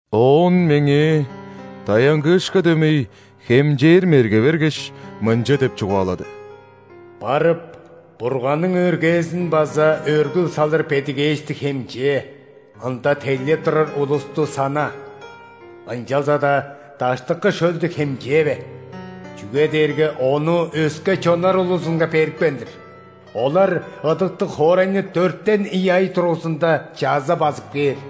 Оон меңээ даянгыышка дөмей хемчээр мерге бергеш, мынча деп чугаалады: «Барып, Бурганның өргээзин база өргүл салыр бедигээшти хемчээ, ында тейлеп турар улусту сана. Ынчалза-даа даштыкы шөлдү хемчээве, чүге дээрге ону өске чоннар улузунга берипкен-дир. Олар ыдыктыг хоорайны дөртен ийи ай дургузунда чаза базып кээр.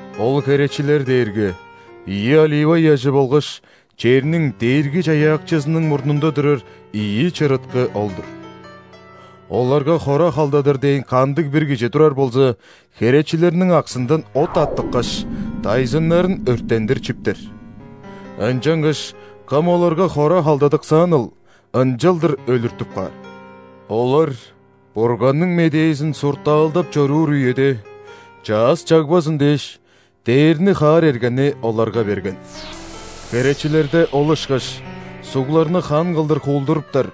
Ол херечилер дээрге ийи олива ыяжы болгаш черниң Дээрги-Чаяакчызының мурнунда турар ийи чырыткы ол-дур. Оларга хора халдадыр дээн кандыг-бир кижи турар болза, херечилерниң аксындан от аттыккаш, дайзыннарын өрттендир чиптер. Ынчангаш кым оларга хора халдадыксааныл, ынчалдыр өлүртүп каар. Олар Бурганның медээзин суртаалдап чоруур үеде чаъс чагбазын дээш, дээрни хаар эргени оларга берген. Херечилерде ол ышкаш сугларны хан кылдыр хуулдуруптар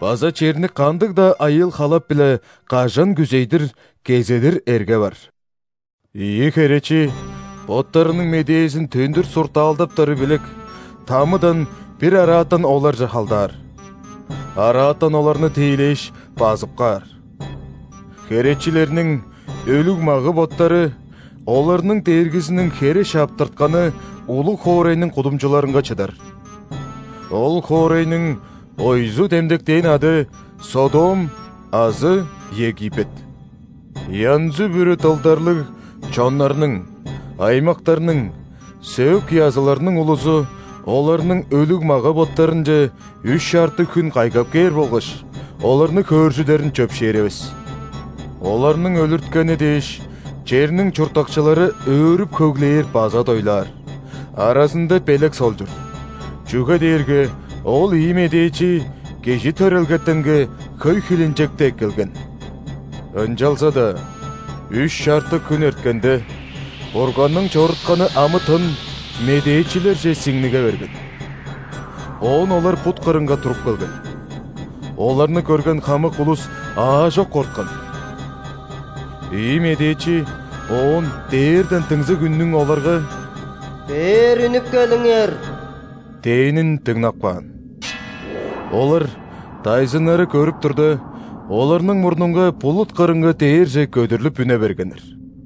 база черни кандыг-даа айыыл-халап-биле, кажан күзей-дир, кезедир эрге бар. Ийи херечи боттарының медээзин төндүр суртаалдаптары билек, ·тамыдан бир араатан оларже халдаар. Араатан оларны тиилээш, базып каар. Херечилерниң өлүг мага-боттары оларның Дээргизиниң хере шаптыртканы улуг хоорайның кудумчуларынга чыдар. Ол хоорайның ойзу демдектээн ады – Содом азы Египет. Янзы-бүрү дылдарлыг чоннарның, аймактарның, сөөк-языларның улузу оларның өлүг мага-боттарынче үш чартык хүн кайгап кээр болгаш оларны хөөржүдерин чөпшээревес. Оларның өлүрткени дээш, черниң чурттакчылары өөрүп-хөглээр база дойлаар, аразында белек солчур, чүге дээрге ол ийи медээчи кижи төрелгетенге хөй хилинчекти эккелген. Ынчалза-даа үш чартык хүн эрткенде, Бурганның чорутканы амы-тын медээчилерже сиңниге берген, оон олар бут кырынга туруп келген. Оларны көрген хамык улус аажок корткан. Ийи медээчи оон дээрден дыңзыг үннүң оларга: «Бээр үнүп келиңер!» – дээнин дыңнап каан. Олар дайзыннары көрүп турда, оларның мурнунга булут кырынга дээрже көдүрлүп үне бергеннер.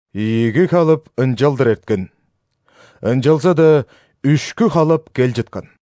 Ийиги халап ынчалдыр эрткен, ынчалза-даа үшкү халап кел чыткан.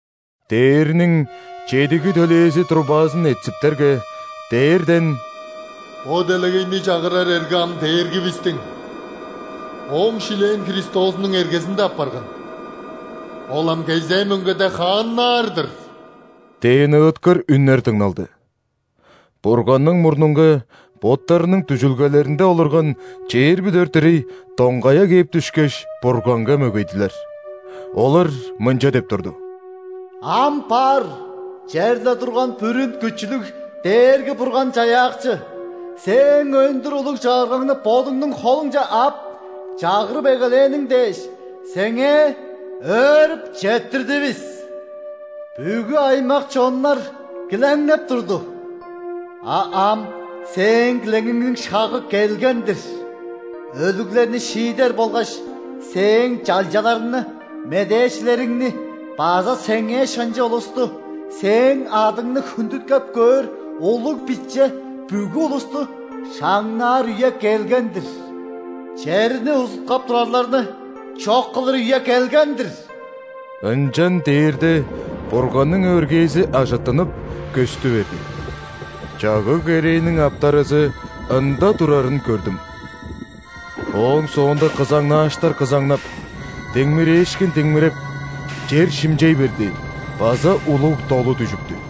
Дээрниң чедиги төлээзи трубазын этсиптерге, дээрден: «Бо делегейни чагырар эрге ам Дээргивистиң, Ооң шилээн Христозунуң эргезинде апарган, Ол ам кезээ мөңгеде хааннаар-дыр!» – дээн ыыткыр үннер дыңналды. Бурганның мурнунга боттарының дүжүлгелеринде олурган чээрби дөрт ирей доңгая кээп дүшкеш, Бурганга мөгейдилер. Олар мынча деп турду:«Ам бар, черле турган Бүрүн Күчүлүг Дээрги-Бурган-Чаяакчы,Сээң өндүр улуг Чагыргаңны Бодуңнуң холуңче ап,чагырып эгелээниң дээш, Сеңээ өөрүп четтирдивис. Бүгү аймак-чоннар килеңнеп турду,а ам Сээң килеңиңниң шагы келген-дир.Өлүглерни шиидер болгаш Сээң чалчаларыңны,медээчилериңни база Сеңээ шынчы улусту,Сээң адыңны хүндүткеп көөр улуг, биче бүгү улустушаңнаар үе келген-дир.Черни узуткап турарларны чок кылыр үе келген-дир!» Ынчан дээрде Бурганның өргээзи ажыттынып, көстү берди. Чагыг-керээниң ·аптаразы ында турарын көрдүм. Ооң соонда кызаңнааштар кызаңнап, диңмирээшкин диңмиреп, чер шимчей берди база улуг долу дүжүптү.